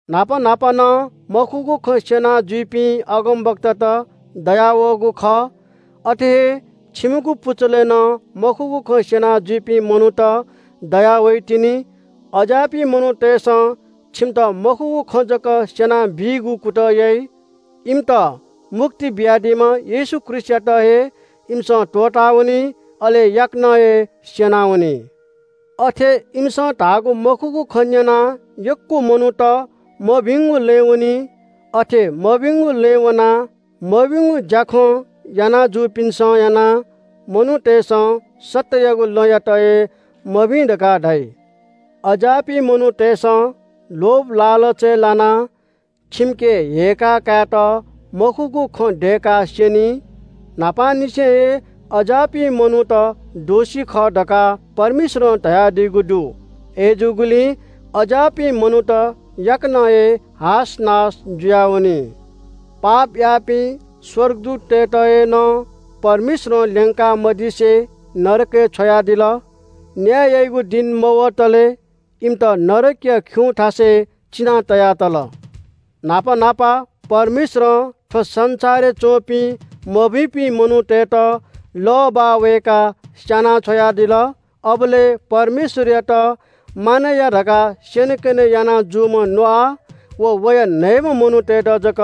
न्‍हापा न्‍हापा नं मखुगु खँ स्‍यना जुइपिं अगमवक्तात दयावःगु खः। अथे हे छिमिगु पुचलय् नं मखुगु खँ स्‍यना जुइपिं मनूत दयावइतिनि। अज्‍याःपिं मनूतय्‌सं छिमित मखुगु खँ जक स्‍यनाबीगु कुतः याइ। इमित मुक्ति बियादीम्‍ह येशू ख्रीष्‍टयात हे इमिसं त्‍वःतावनी, अले याकनं हे स्‍यनावनी। अथे इमिसं धाःगु मखुगु खँ न्‍यनाः यक्‍व मनूत मभिंगु लँय् वनी। अथे मभिंगु लँय् वनाः मभिंगु ज्‍याखँ यानाजूपिन्‍सं यानाः मनूतय्‌सं सत्‍ययागु लँयात हे मभिं धकाः धाइ। अज्‍याःपिं मनूतय्‌सं लोभलालचय् लानाः छिमिके हेय्‌का कायेत मखुगु खँ दय्‌काः स्‍यनी। न्‍हापांनिसें हे अज्‍याःपिं मनूत दोषी खः धकाः परमेश्‍वरं धयादीगु दु। अय्‌जूगुलिं अज्‍याःपिं मनूत याकनं हे हासनास जुयावनी। पाप याःपिं स्‍वर्गदूततय्‌त हे नं परमेश्‍वरं ल्‍यंका मदिसे नरकय् छ्वयादिल। न्‍याय याइगु दिं मवतले इमित नरकया खिउँथासय् चिनाः तया तल। न्‍हापा न्‍हापा परमेश्‍वरं थ्‍व संसारय् च्‍वंपिं मभिंपिं मनूतय्‌त लः बाः वय्‌काः स्‍याना छ्वयादिल। अबलय् परमेश्‍वरयात मानय् या धकाः स्‍यनेकने याना जूम्‍ह नोआ व वया न्‍हय्‌म्‍ह मनूतय्‌त जक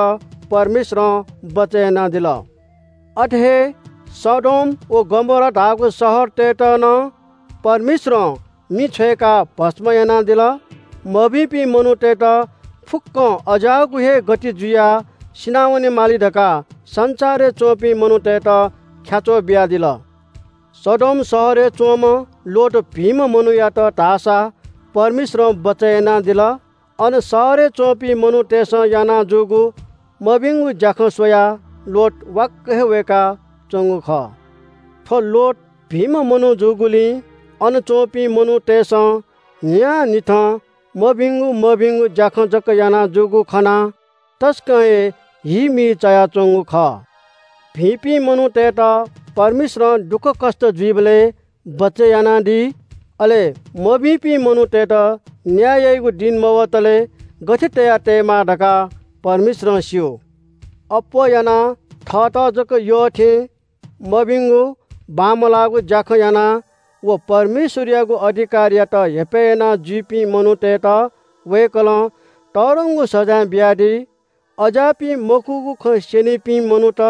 परमेश्‍वरं बचय् यानादिल। अथे हे सदोम व गमोरा धाःगु शहरतय्‌त नं परमेश्‍वरं मिं छ्वय्‌काः भस्‍म यानादिल। मभिंपिं मनूत फुक्‍कं अज्‍याःगु हे गति जुयाः सिनावनेमाली धकाः संसारय् च्‍वंपिं मनूतय्‌त ख्‍याच्‍वः बियादिल। सदोम शहरय् च्‍वंम्‍ह लोत भिंम्‍ह मनूयात धाःसा परमेश्‍वरं बचय् यानादिल। अन शहरय् च्‍वंपिं मनूतय्‌सं याना जूगु मभिंगु ज्‍याखँ स्‍वयाः लोत वाक्‍क हे वय्‌काच्‍वंगु खः। थ्‍व लोत भिंम्‍ह मनू जूगुलिं अन च्‍वंपिं मनूतय्‌सं न्‍हियान्‍हिथं मभिंगु मभिंगु ज्‍याखँ जक याना जूगु खनाः तसकं हे हीमी चायाच्‍वंगु खः। भिंपिं मनूतय्‌त परमेश्‍वरं दुःखकष्‍ट जुइबलय् बचय् यानादी। अले मभिंपिं मनूतय्‌त न्‍याय याइगु दिं मवतले गथे तयातयेमाः धकाः परमेश्‍वरं स्‍यू। अप्‍वः यानाः थःत जक यःथें मभिंगु बांमलाःगु ज्‍याखँ यानाः व परमेश्‍वरयागु अधिकारयात हेपय् यानाजुइपिं मनूतय्‌त वय्‌कलं तःधंगु सजाँय बियादी। अज्‍याःपिं मखुगु खँ स्‍यनीपिं मनूत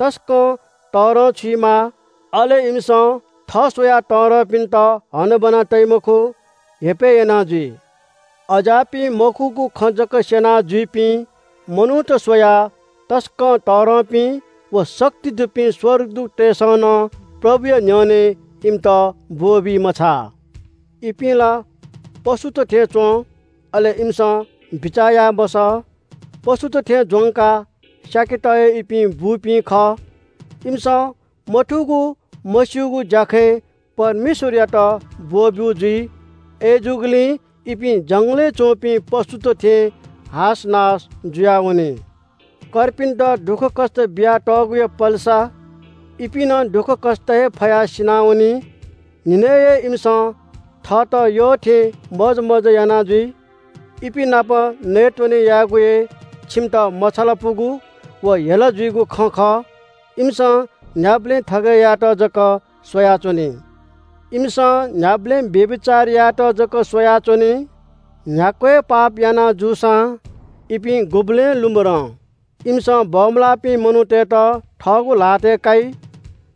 तसकं तःधंछुइमाः। अले इमिसं थः स्‍वयाः तःधंपिन्‍त हनाबना तइ मखु, हेपय् याना जुइ। अज्‍याःपिं मखुगु खँ जक स्‍यना जुइपिं मनूत स्‍वयाः तसकं तःधंपिं व शक्ति दुपिं स्‍वर्गदूततय्‌सं नं प्रभुया न्‍ह्यःने इमित ब्‍वःबी मछाः। इपिं ला पशुत थें च्‍वं, अले इमिसं बिचाः याये मसः। पशुत थें ज्‍वंकाः स्‍याकेत हे इपिं बूपिं खः। इमिसं मथूगु मस्‍यूगु ज्‍याखँय् परमेश्‍वरयात ब्‍वः ब्‍यू जुइ। अय्‌जूगुलिं इपिं जंगलय् च्‍वंपिं पशुत थें हासनास जुयावनी। कर्पिन्‍त दुःखकष्‍ट बिया तःगुया पलेसा इपिं नं दुःखकष्‍ट हे फयाः सिनावनी। न्‍हिनय् हे इमिसं थःत यःथें मोजमज्‍जा याना जुइ। इपिं नाप नयेत्‍वने यायेगु हे छिमित मछालापुगु व हेला जुइगु खँ खः। इमिसं न्‍ह्याबलें थगय् यायेत जक स्‍वयाच्‍वनी। इमिसं न्‍ह्याबलें व्‍यभिचार यायेत जक स्‍वयाच्‍वनी। न्‍ह्याक्‍व हे पाप याना जूसां इपिं गुबलें लुमधं। इमिसं बमलाःपिं मनूतय्‌त थःगु ल्‍हातय् काइ।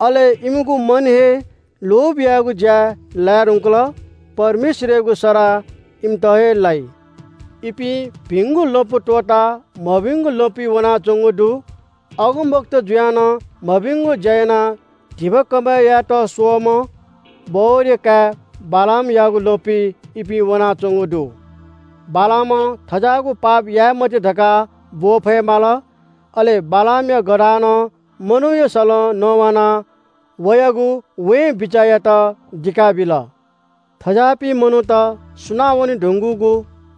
अले इमिगु मन हे लोभ यायेगु ज्‍याय् लाये धुंकल। परमेश्‍वरयागु सराः इमित हे लाइ। इपिं भिंगु लँपु त्‍वःताः मभिंगु लँपुइ वनाच्‍वंगु दु। अगमवक्ता जुयाः नं मभिंगु ज्‍या यानाः धिबा कमय् यायेत स्‍वःम्‍ह बओरया काय् बालामयागु लँपुइ इपिं वनाच्‍वंगु दु। बालामं थज्‍याःगु पाप याये मते धकाः ब्‍वः फये माल। अले बालामया गधानं मनूया सलं नवानाः व अगमवक्तायागु वें बिचाःयात दिका बिल। थज्‍याःपिं मनूत सुनावने धुंकूगु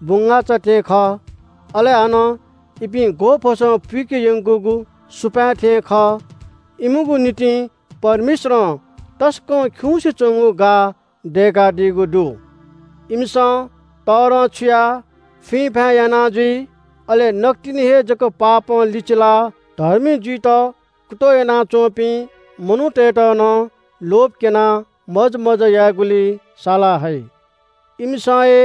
बुंगाःचा थें खः, अले हानं इपिं ग्‍वःफसं पुइके यंकूगु सुपाँय् थें खः। इमिगु निंतिं परमेश्‍वरं तसकं खिउँसे च्‍वंगु गाः दय्‌कादीगु दु। इमिसं तःधंछुयाः फुइँफाँय् याना जुइ। अले नकतिनि हे जक पापं लिचिलाः धर्मी जुइत कुतः यानाच्‍वंपिं मनूतय्‌त नं लोभ क्‍यनाः मोजमज्‍जा यायेगुलिइ साला हइ। इमिसं हे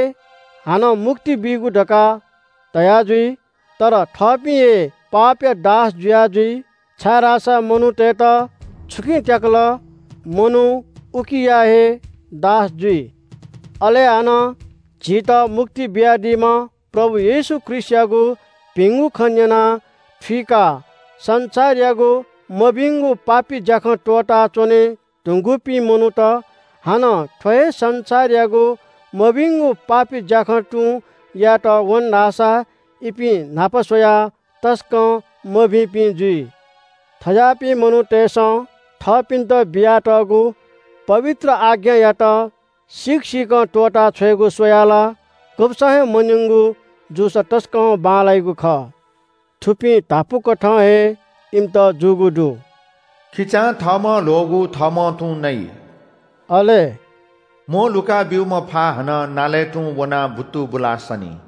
हानं मुक्ति बीगु धकाः धयाजुइ, तर थःपिं हे पापया दास जुया जुइ, छाय्‌धाःसा मनूतय्‌त छुकिं त्‍याकल मनू उकिया हे दास जुइ। अले हानं झीत मुक्ति बियादीम्‍ह प्रभु येशू ख्रीष्‍टयागु भिंगु खँ न्‍यनाः थुइकाः संसारयागु मभिंगु पापी ज्‍याखँ त्‍वःता च्‍वनेधुंकूपिं मनूत हानं थ्‍व हे संसारयागु मभिंगु पापी ज्‍याखँ तुं यायेत वन धाःसा इपिं न्‍हापा स्‍वयाः तसकं मभिंपिं जुइ। थज्‍याःपिं मनूतय्‌सं थःपिन्‍त बियातःगु पवित्र आज्ञायात सीक सीकं त्‍वःताछ्वयेगु स्‍वयाः ला गुब्‍सं हे मन्‍यंगु जूसा तसकं बांलाइगु खः। थुपिं धापू कथं हे इमित जूगु दु – “खिचां थःम्‍हं ल्‍ह्वःगु थःम्‍हं तुं नइ” अले “म्‍वःल्‍हुका ब्‍यूम्‍ह फा हानं नालय् तुं वनाः बुत्तुबुलाः सनी।”